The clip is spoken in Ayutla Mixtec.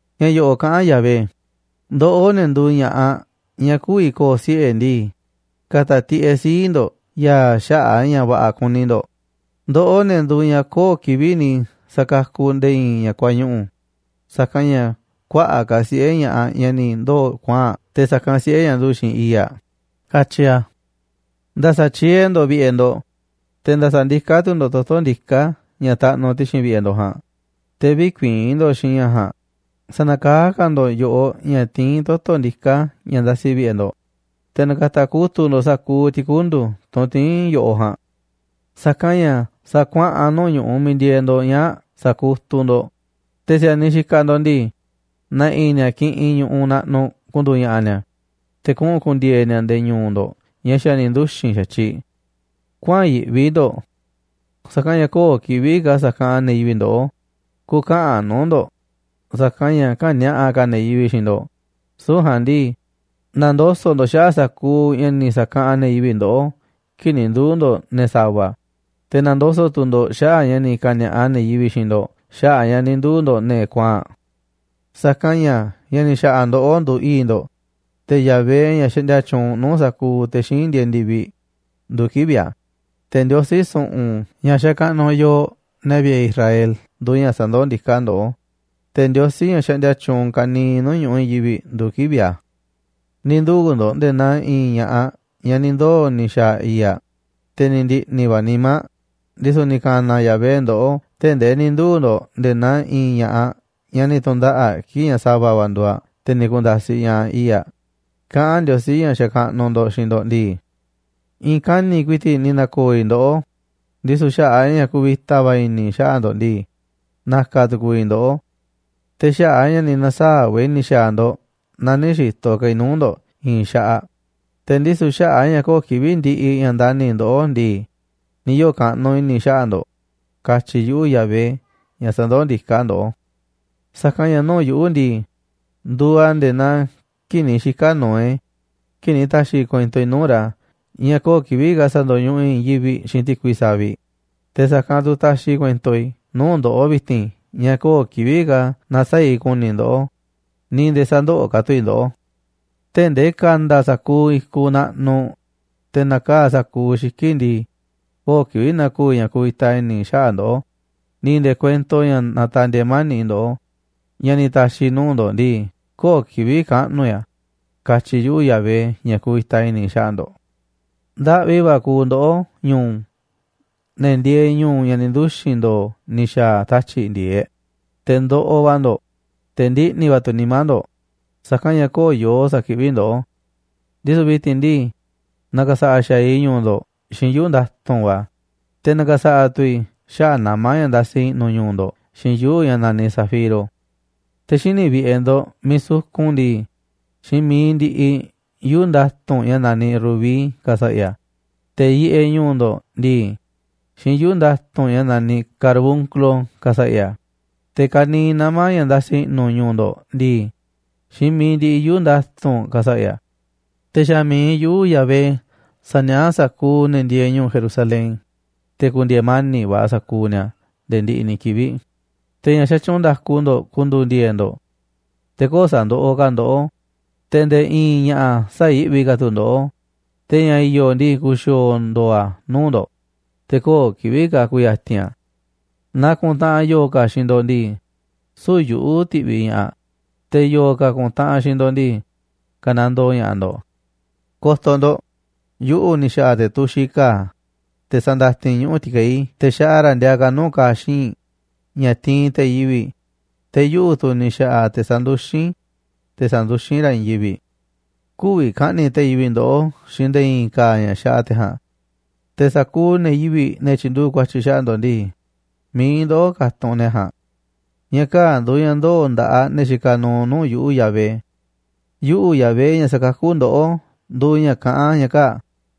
Ña̱ yo̱ꞌo̱ꞌ kaꞌán Yahvé: “Ndoꞌó, ne̱ nduuꞌ ña̱ꞌaꞌ ñaꞌ kü̱vi̱ ko̱o̱ siꞌe̱ ndii, ka̱ta̱ tiꞌeꞌ sii̱ꞌ ndo̱ꞌ ya̱a̱ xaꞌa̱ꞌ a̱ ña̱ va̱ꞌa̱ kuni ndo̱ꞌ, ndoꞌó, ne̱ nduuꞌ ñaꞌ köo̱ꞌ kivi̱ꞌ ni̱ sa̱kakuꞌ nde̱e̱ i̱i̱n ña̱ kuañuꞌu̱. Sa̱kanꞌ ña̱ kuaꞌa̱ꞌ ka̱ siꞌe̱ ña̱ꞌaꞌ ñaꞌ ni̱ ndoo̱ kuaa̱nꞌ te̱ sa̱kanꞌ siꞌe̱ ñaꞌ nduꞌu̱ꞌ xiinꞌ i̱i̱ꞌ aꞌ”, katyi a̱. Nda̱sa̱ tyiee̱ ndo̱ꞌ vi̱ꞌe̱ ndo̱ꞌ, te̱ nda̱sa̱ ndiká tu̱ ndo̱ꞌ toto̱ ndiká ña̱ taꞌnuꞌ ti̱xi̱n vi̱ꞌe̱ ndo̱ꞌ ja̱a̱nꞌ, te̱ vï̱kuii̱n ndo̱ꞌ xiinꞌ ña̱ ja̱a̱nꞌ. Sa̱nakaá ka̱ ndo̱ꞌ yo̱ꞌoꞌ ña̱ tiín toto̱ ndiká ña̱ ndasi vi̱ꞌe̱ ndo̱ꞌ, te̱ na̱ka̱ta̱ kutu̱ꞌ ndo̱ꞌ sa̱kuuꞌ ti̱kundu̱ tunꞌ tiín yo̱ꞌoꞌ ja̱a̱nꞌ. Sa̱kanꞌ ña̱ sa̱a̱ kuaꞌa̱n nuu̱ꞌ ñu̱ꞌuꞌ miiꞌ ndieeꞌ ndo̱ꞌ ñaa̱ꞌ sa̱kutuꞌ ndo̱ꞌ. Te̱ si̱a̱niꞌ xikaꞌ ndo̱ꞌ ndii, na̱ꞌi̱ ni̱a̱ kiꞌinꞌ ñu̱ꞌu̱ꞌ naꞌnuꞌ ku̱ndu̱u̱ ña̱ꞌa̱ ni̱a̱, te̱ kuꞌu̱n ku̱ndi̱e̱e̱ ni̱a̱ nde̱e̱ ñu̱u̱ ndo̱ꞌ ña̱ xa̱ ni̱ nduxi̱n xa̱tyiꞌ. Kuäa̱n yiꞌvi ndo̱ꞌ, sa̱kanꞌ ña̱ köo̱ꞌ kivi̱ꞌ ka̱ sa̱kaꞌanꞌ ne̱ yivi̱ꞌ ndoꞌó. Ku̱kä̱ꞌa̱n nuu̱ꞌ ndo̱ꞌ sa̱kanꞌ ña̱ kä̱ni̱a̱ꞌa ka̱ ne̱ yivi̱ꞌ xiinꞌ ndo̱ꞌ. Süu̱ꞌ ja̱a̱nꞌ ndii, na̱ndoso̱ꞌ ndo̱ꞌ xaꞌa̱ꞌ sa̱kuuꞌ ña̱ ni̱ sa̱kaꞌanꞌ ne̱ yivi̱ꞌ ndoꞌó kii̱ꞌ ni̱ nduu̱ ndo̱ꞌ ne̱ sa̱va̱. Te̱ na̱ndoso̱ꞌ tu̱ ndo̱ꞌ xaꞌa̱ꞌ ña̱ ni̱ ka̱ni̱a̱ꞌa ne̱ yivi̱ꞌ xiinꞌ ndo̱ꞌ xaꞌa̱ꞌ ña̱ ni̱ nduu̱ ndo̱ꞌ ne̱ kuaa̱nꞌ. Sa̱kanꞌ ña̱ ña̱ ni̱ xa̱ꞌa̱ ndoꞌó nduuꞌ i̱i̱ꞌ ndo̱ꞌ, te̱ Yahvé, ña̱ xaꞌndia tyuunꞌ nuu̱ꞌ sa̱kuuꞌ te̱ xíinꞌ ndieeꞌ ndi̱viꞌ, nduuꞌ kivi̱ꞌ a̱. Te̱ Ndiosí su̱ꞌu̱n ña̱ xakaꞌnuꞌ yooꞌ, ne̱ vi̱ꞌe̱ Israel, nduuꞌ ña̱ sandoó ndiká ndoꞌó. Te̱ Ndiosí, ña̱ xaꞌndia tyuunꞌ ka̱niiꞌ nuu̱ꞌ ñu̱ꞌuꞌ i̱i̱n yivi̱ꞌ, nduuꞌ kivi̱ꞌ a̱. Ni̱ nduu̱ ndo̱ꞌ nde̱e̱ naa i̱i̱n ña̱ꞌaꞌ ñaꞌ ni̱ ndoo̱ ni̱ xa̱a̱ i̱i̱ꞌ aꞌ, te̱ ni̱ ndi̱ꞌni̱ va̱ nimá aꞌ. Ndisu̱ ni̱ ka̱na̱ Yahvé ndoꞌó tee̱ꞌ ndee ni̱ nduu̱ ndo̱ꞌ nde̱e̱ naa i̱i̱n ña̱ꞌaꞌ ñaꞌ ni̱ tu̱ndaꞌa̱ꞌ kii̱ꞌ ñaꞌ sa̱va̱ va̱ nduuꞌ, te̱ ni̱ ku̱nda̱siꞌ ña̱ꞌaꞌ i̱i̱ꞌ aꞌ, kaꞌán Ndiosí, ña̱ xakaꞌnuꞌ ndo̱ꞌ, xiinꞌ ndo̱ꞌ ndii: “I̱i̱n kani̱ꞌ ku̱i̱ti̱ꞌ ni̱ na̱ko̱o̱ i̱ ndoꞌó, ndisu̱ xaꞌa̱ꞌ a̱ ña̱ kuvita va̱ i̱ni̱ i̱ xaꞌa̱ꞌ ndo̱ꞌ ndii, na̱ka̱ tu̱ku̱u̱ i̱ ndoꞌó. Te̱ xaꞌa̱ꞌ a̱ ña̱ ni̱ na̱saa̱ꞌ va̱ i̱ ni̱ xa̱a̱ ndo̱ꞌ na nï̱ xi̱to̱ ka̱ i̱ nuu̱ꞌ ndo̱ꞌ i̱i̱n xaꞌaꞌ. Te̱ ndisu̱ xaꞌa̱ꞌ a̱ ña̱ köo̱ꞌ kivi̱ꞌ ndiꞌiꞌ ña̱ ndani̱ i̱ ndoꞌó ndii, ni̱ yoo̱ kaꞌnuꞌ i̱ni̱ xaꞌa̱ꞌ ndo̱ꞌ, katyi̱ yuꞌu̱, Yahvé, ña̱ sa̱ndoó ndiká ndoꞌó. ’Sa̱kanꞌ ña̱ nuu̱ꞌ yuꞌu̱ ndii, nduuꞌ a̱ nde̱e̱ naa kii̱ꞌ ni̱ xika̱ Noé, kii̱ꞌ ni̱ ta̱xi̱ i̱ kuento i̱ nuu̱ꞌ ra̱ ña̱ köo̱ꞌ kivi̱ꞌ ka̱ sa̱ndo̱ñuꞌuꞌ i̱ i̱i̱n yivi̱ꞌ xiinꞌ ti̱kui saviꞌ. Te̱ sa̱kanꞌ tu̱ taxiꞌ i̱ kuento i̱ nuu̱ꞌ ndoꞌó vi̱ti̱n ña̱ köo̱ꞌ kivi̱ꞌ ka̱ na̱saa̱ꞌ i̱ ku̱ni̱ i̱ ndoꞌó ni̱ nde̱e̱ sä̱ndoꞌoꞌ ka̱ tu̱ i̱ ndoꞌó. Tee̱ꞌ ndee ka̱nda̱ sa̱kuuꞌ i̱kuꞌ naꞌnuꞌ, te̱ na̱kaa̱ꞌ sa̱kuuꞌ xiki̱ꞌ ndii, köo̱ꞌ kivi̱ꞌ na̱ko̱o̱ i̱ ña̱ kuvita i̱ni̱ i̱ xaꞌa̱ꞌ ndoꞌó, ni̱ nde̱e̱ kuento ña̱ natandieeꞌ mani̱ꞌ ndoꞌó ña̱ ni̱ ta̱xi̱ i̱ nuu̱ꞌ ndo̱ꞌ ndii, köo̱ꞌ kivi̱ꞌ kaꞌnu̱ i̱ a̱, katyi̱ yuꞌu̱, Yahvé, ña̱ kuvita i̱ni̱ xaꞌa̱ꞌ ndo̱ꞌ. ’Ndaꞌvi va̱ kuuꞌ ndoꞌó ñu̱u̱ ne̱ ndieeꞌ ñu̱u̱ ña̱ ni̱ nduxi̱n ndo̱o̱ ni̱ xa̱a̱ tatyi̱ꞌ ndi̱e̱eꞌ. Te̱ ndoꞌoꞌ va̱ ndo̱ꞌ, te̱ ndiꞌni̱ va̱ tu̱ nimá ndo̱ꞌ, sa̱kanꞌ ña̱ köo̱ꞌ yoo sa̱kiꞌví ndoꞌó. Ndisu̱ vi̱ti̱n ndii, na̱ka̱sa̱ꞌa̱ xa̱aꞌ i̱ ñu̱u̱ ndo̱ꞌ xiinꞌ yuu̱ꞌ nda̱tu̱nꞌ va̱, te̱ na̱ka̱sa̱ꞌa̱ tu̱ i̱ xaꞌa̱ꞌ nama̱ ña̱ ndasi i̱ꞌnu̱ ñu̱u̱ ndo̱ꞌ xiinꞌ yuu̱ꞌ ña̱ naniꞌ zafiro. Te̱ xíniꞌ vi̱ꞌe̱ ndo̱ꞌ miiꞌ sukun ndii, xiinꞌ mi̱iꞌ ndiꞌiꞌ yuu̱ꞌ nda̱tu̱nꞌ ña̱ naniꞌ rubí ka̱sa̱ꞌa̱ i̱ a̱. Te̱ yiꞌeꞌ ñu̱u̱ ndo̱ꞌ ndii, xiinꞌ yuu̱ꞌ nda̱tu̱nꞌ ña̱ naniꞌ carbunclo ka̱sa̱ꞌa̱ i̱ a̱. Te̱ ka̱niiꞌ nama̱ ña̱ ndasi i̱ꞌnu̱ ñu̱u̱ ndo̱ꞌ ndii, xiinꞌ mi̱iꞌ ndiꞌiꞌ yuu̱ꞌ nda̱tu̱nꞌ ka̱sa̱ꞌa̱ i̱ a̱. Te̱ xa̱ mi̱iꞌ yuꞌu̱ Yahvé sa̱nia̱ꞌá sa̱kuuꞌ ne̱ ndieeꞌ ñu̱u̱ Jerusalén, te̱ ku̱ndi̱e̱e̱ mani̱ꞌ va̱ sa̱kuuꞌ ni̱a̱ nde̱e̱ ndiꞌiꞌ ni̱ kivi̱ꞌ. Te̱ ña̱ xatyuunꞌ nda̱ku ndo̱ꞌ ku̱ndu̱u̱ ndi̱e̱e̱ꞌ ndo̱ꞌ, te̱ köo̱ꞌ sa̱ndoꞌoꞌ ka̱ ndoꞌó, te̱ nde̱e̱ i̱i̱n ña̱ꞌa̱ sä̱yi̱ꞌvi ka̱ tu̱ ndoꞌó. Te̱ ña̱ i̱yo̱ ndii, ku̱xi̱o̱o̱ ndo̱o̱ a̱ nuu̱ꞌ ndo̱ꞌ, te̱ köo̱ꞌ kivi̱ꞌ ka̱ ku̱ya̱ti̱n a̱. Naaꞌ kuntaꞌanꞌ yo̱o̱ ka̱ xiinꞌ ndo̱ꞌ ndii, süu̱ꞌ yuꞌu̱ ti̱ꞌviꞌ ña̱ꞌaꞌ. Te̱ yo̱o̱ ka̱ ku̱ntaꞌanꞌ xiinꞌ ndo̱ꞌ ndii, ka̱nandoo ña̱ꞌaꞌ ndo̱ꞌ. ’Ko̱to̱ ndo̱ꞌ, yuꞌu̱ ni̱ xa̱ꞌa̱ te̱ tuxiꞌ ka̱a̱, te̱ sandatin ñuꞌu̱ ti̱kei̱ te̱ xaꞌa ra̱ ndiaa ka̱ nuu̱ꞌ ka̱a̱ xii̱nꞌ, ña̱ tiinꞌ te̱ yivi̱ꞌ. Te̱ yuꞌu̱ tu̱ ni̱ xa̱ꞌa̱ te̱ sanduxín, te̱ sa̱nduxín ra̱ i̱i̱n yivi̱ꞌ. Kü̱vi̱ ka̱ꞌni̱ꞌ te̱ yivi̱ꞌ ndoꞌó xiinꞌ nde̱e̱ i̱i̱n ka̱a̱ ña̱ xaꞌa te̱ ja̱a̱nꞌ. Te̱ sa̱kuuꞌ ne̱ yivi̱ꞌ, ne̱ tyi̱nduꞌu̱ꞌ ku̱a̱tyi̱ xaꞌa̱ꞌ ndo̱ꞌ ndii, mi̱iꞌ ndoꞌó ka̱tunꞌ sa̱kuuꞌ ne̱ ja̱a̱nꞌ. Ña̱ kaa̱ꞌ nduuꞌ ña̱ ndoo̱ nda̱ꞌaꞌ ne̱ xikaꞌ nuuꞌ nuu̱ꞌ yuꞌu̱, Yahvé. Yuꞌu̱, Yahvé, ña̱ sa̱kakú ndoꞌó, nduuꞌ ña̱ kaꞌán ña̱ kaa̱ꞌ.